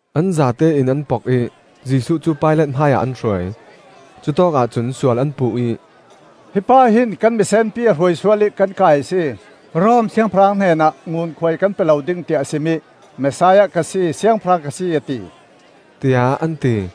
An zatein an pok ih Jesuh cu Pilat hmaiah an hruai. Cutawkah cun sual an puh ih, “Hi pa hin kan misenpi a hruai sual ih kan kai a si; Rom Siangpahrang hnenah ngunkhuai nan pe lo ding, tiah a sim ih, ‘Messiah ka si, Siangpahrang ka si,’ a ti,” tiah an ti.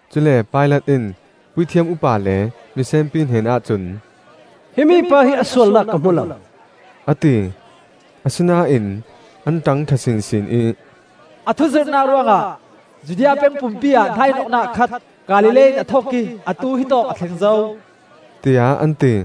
Cule Pilat in puithiam upa le misenpi hnenah cun, “Himi pa hi a sualnak ka hmu lo,” a ti. Asinain an ṭangṭha sinsin ih, “A thu zirhnak ruangah Judea peng pumpi-ah hnaihnawhnak a khat. Galilee in a thawh ih atu hitawk a thleng zo,” tiah an ti.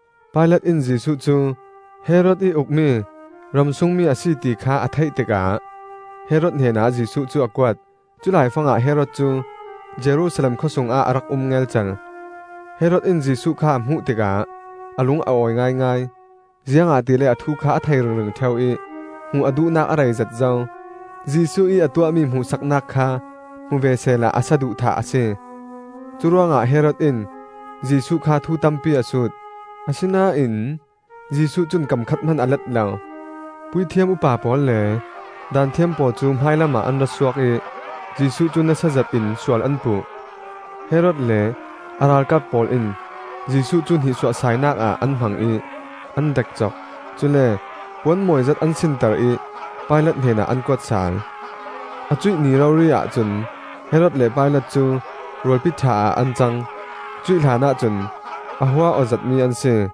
Pilat in Jesuh cu Herod ih ukmi ram sungmi a si ti kha a theih tikah Herod hnenah Jesuh cu a kuat. Culai fangah Herod cu Jerusalem khawsungah a rak um ngelcel. Herod in Jesuh kha a hmuh tikah a lung a awi ngaingai, ziangahtile a thu kha a thei ringring ṭheu ih hmuh a duhnak a rei zet zo. Jesuh ih a tuahmi hmuhsaknak kha hmu ve sehla a saduhthah a si. Curuangah Herod in Jesuh kha thu tampi a sut, asinain Jesuh cun kam khat hman a let lo. Puithiam upa pawl le Daanthiam pawl cu hmailamah an ra suak ih Jesuh cu nasazet in sual an puh. Herod le a ralkap pawl in Jesuh cu hnihsuahsainak ah an hmang ih an dekcok. Cule puan mawizet an sinter ih Pilat hnenah an kuat sal. A cuih ni rori-ah cun Herod le Pilat cu rualpi ṭha ah an cang; cuih hlanah cun a hua aw zetmi an si.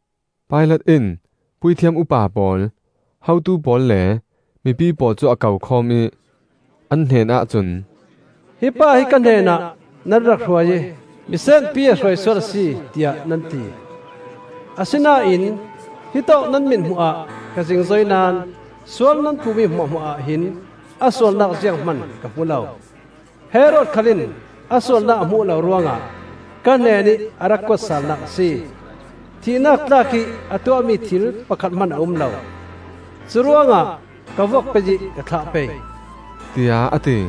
Pilat in puithiam upa pawl, hotu pawl le mipi pawl cu a kokhawm ih, an hnenah cun, “Hi pa hi ka hnenah nan rak hruai ih misenpi a hruai sual a si, tiah nan ti. Asinain hitawk nan mithmuh ah ka zingzoi naón sual nan puh mi hmuahhmuah ahhin a sualnak zianghman ka hmu lo. Herod khal in a sualnak a hmuh lo ruangah ka hnenih a rak kuat salnak a si. Thihnak tlak ih a tuahmi thil pakhat hman a um lo. Curuangah ka vuak pei ih ka thlah pei,” tiah a ti.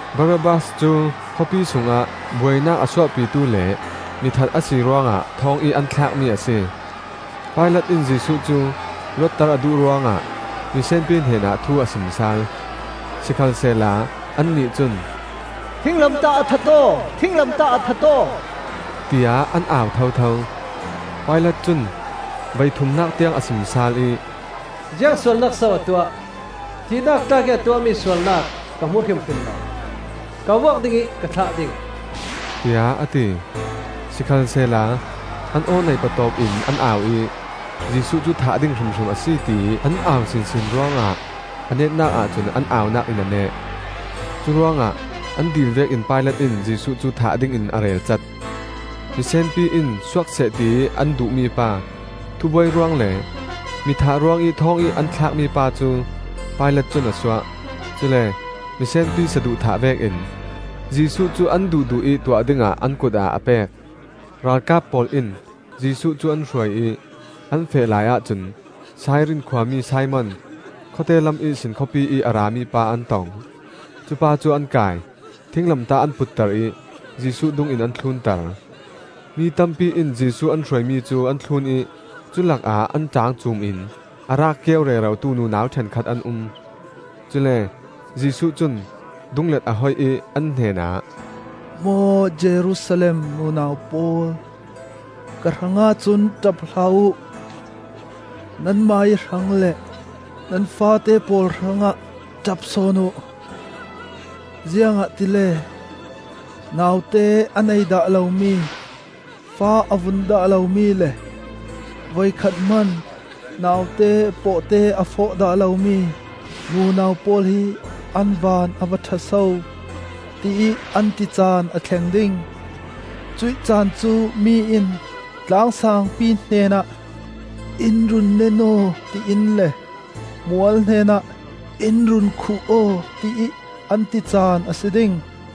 (Barabbas cu khawpi sungah buainak a suahpitu le mithat a si ruangah thawngih an thlakmi a si.) Pilat in Jesuh cu luatter a duh ruangah misenpi hnenah thu a sim sal. Sikhalsehla annih cun, “Thinglamtah ah that aw! Thinglamtah ah that aw!” tiah an au thotho. Pilat cun voithumnak tiang a sim sal ih, “Ziang sualnak so a tuah? Thihnak tlak ih a tuahmi sualnak ka hmu hrimhrim lo. Ka vuak ding ih ka thlah ding,” tiah a ti. Sikhalsehla an aw neih patawp in an au ih Jesuh cu thah ding hrimhrim a si, tiih an au sinsin ruangah a netnak ahcun an au-nak in a neh. Curuangah an dil vekin Pilat in Jesuh cu thah dingin a relcat. Misenpi in suak seh tiih an duh mipa, thubuai ruang le mi thah ruangih thawngih an thlak mipa cu Pilat cun a suah; cule misenpi saduhthah vekin Jesuh cu an duhduh ih tuah dingah an kut ah a pek. Ralkap pawl in Jesuh cu an hruai ih an feh laiah cun Sairin khua mi Simon, khawte lam ihsin khawpiih a rami pa an tong. Cupa cu an kai, thinglamtah an putter ih Jesuh dungin an thlunter. Mi tampi in Jesuh an hruaimi cu an thlun ih cu lakah an ṭaang cuum in a raak kio rerotu nunau ṭhenkhat an um. Cule Jesuh cun dunglet a hoih ih an hnenah, “Maw Jerusalem nunau pawl, ka hrangah cun ṭap hlah uh; nanmah ih hrang le nan faate pawl hrangah ṭap sawn uh. Ziangahtile ‘Naute a nei dah lomi, fa a vun dah lomi le voikhat hman naute pawhte a fawh dah lomi nunau pawl hi an van a va ṭha so!’ tiih an ti caan a thleng ding. Cuih caan cu mi in tlang sangpi hnenah ‘In run nen aw,’ tiin le mual hnenah ‘In run khuh aw,’ tiih an ti caan a si ding.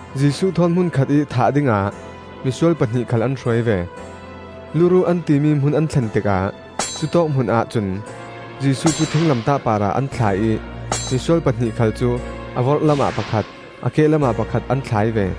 Jesuh thawn hmun khatih thah dingah misual pahnih khal an hruai ve. “Luruh,” an timi hmun an thlen tikah cutawk hmunah cun Jesuh cu thinglamtah parah an thlai ih misual pahnih khal cu a vorhlam ah pakhat, a kehlam ah pakhat an thlai ve.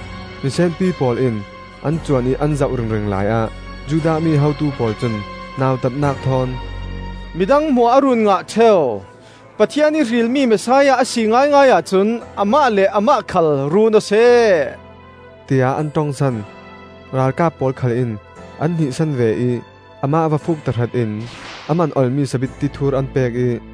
Misenpi pawl in an cuan ih an zoh ringring laiah Judah mi hotu pawl cun nautatnak thawn, “Midang hmuah a run ngah ṭheu; Pathian ih hrilmi Messiah a si ngaingai ahcun amah le amah khal run aw seh,” tiah an ṭongsan. Ralkap pawl khal in an hnihsan ve ih amah va fuuk tahratin a man olmi sabitti thur an pek ih,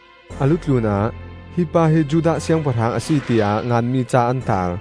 A lu tlun ah, “Hi pa hi Judah Siangpahrang a si,” tiah nganmi ca an taar.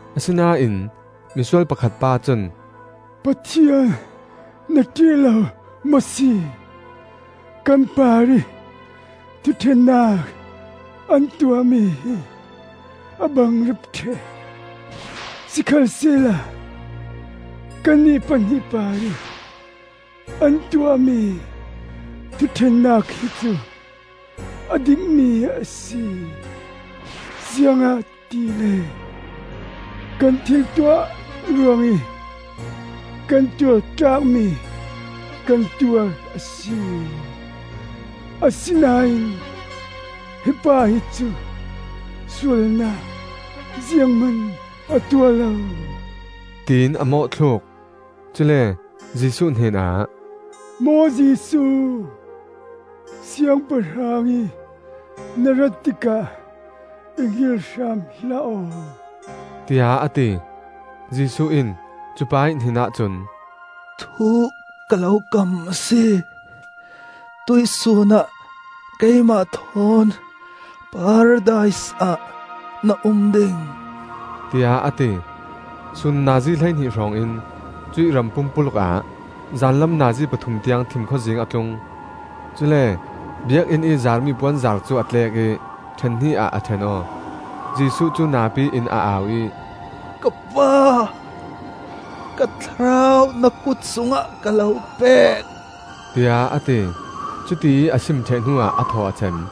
Asinain misual pakhat pa cun, “Pathian na ṭih lo maw si? Kan parih thuṭhennak an tuahmi hi a bangrep ṭheh. Sikhalsehla kannih pahnih parih an tuahmi thuṭhennak hi cu a dikmi a si, ziangahtile kan thil tuah ruangih kan tuar tlakmi kan tuar a si. Asinain hi pa hi cu sualnak zianghman a tuah lo,” tiin a mawhthluk. Cule Jesuh hnenah, “Maw Jesuh, Siangpahrang ih na rat tikah i hngilh hram hlah aw,” tiah a ti. Jesuh in cu pa ih hnenah cun, “Thu ka lo kam a si: tuihsun ah keimah thawn Paradis ah na um ding,” tiah a ti. Sun nazi hleihnih hrawngin cuih ram pumpuluk ah zanlam nazi pathum tiang thimkhawzing a tlung. Cule Biakinn ih zaarmi puanzar cu a tlek ih ṭhen hnih ah a ṭhen aw. Jesuh cu napi in a au ih, “Ka pa, ka thlarau na kut sungah ka lo pe,” tiah a ti. Cutiih a sim ṭheh hnuah a thaw a cem.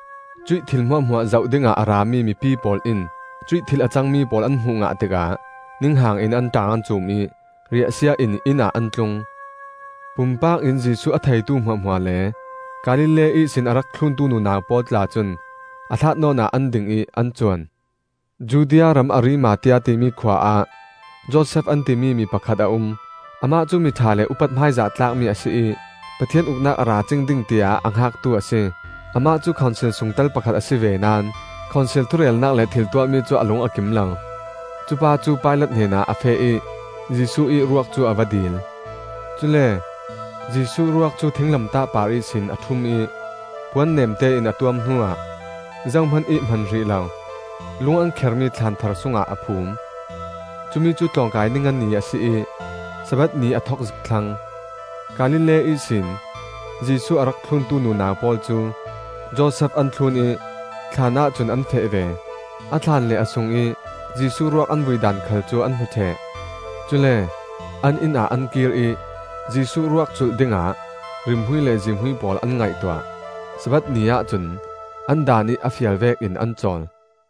Cuih thil hmuahhmuah zoh dingah a rami mipi pawl in cuih thil a cangmi pawl an hmuh ngah tikah ninghang in an ṭaang an cuum ih riahsia in innah an tlung. Pumpak in Jesuh a theitu hmuahhmuah le Galilee ihsin a rak thluntu nunau pawl tla cun a hlat nawnah an ding ih an cuan. Judea ram Arimathea timi khua ah Josef an timi mi pakhat a um. Amah cu miṭha le upat hmaizah tlakmi a si ih Pathian Uknak a ra cing ding, tiah a hngaktu a si. Amah cu khonsil sungtel pakhat a si ve naón khonsil thurelnak le thiltuahmi cu a lung a kim lo. Cupa cu Pilat hnenah a feh ih Jesuh ih ruak cu a va dil. Cule Jesuh ruak cu thinglamtah par ihsin a ṭhum ih puan neemte in a tuam hnuah zohman ih hman hrih lo, lung an khermi thlaan thar sungah a phum. Cumi cu tlawngkai ni nga ni a si ih Sabbath ni a thok zik thlang. Galilee ihsin Jesuh a rak thluntu nunau pawl cu Josef an thlun ih thlaanah cun an feh ve. A thlaan le a sungih Jesuh ruak an vui daan khal cu an hmu ṭheh. Cule an inn ah an kir ih Jesuh ruak culh dingah rimhmui le zihmui pawl an ngaihtuah. Sabbath ni-ah cun an Daan ih a fial vekin an cawl.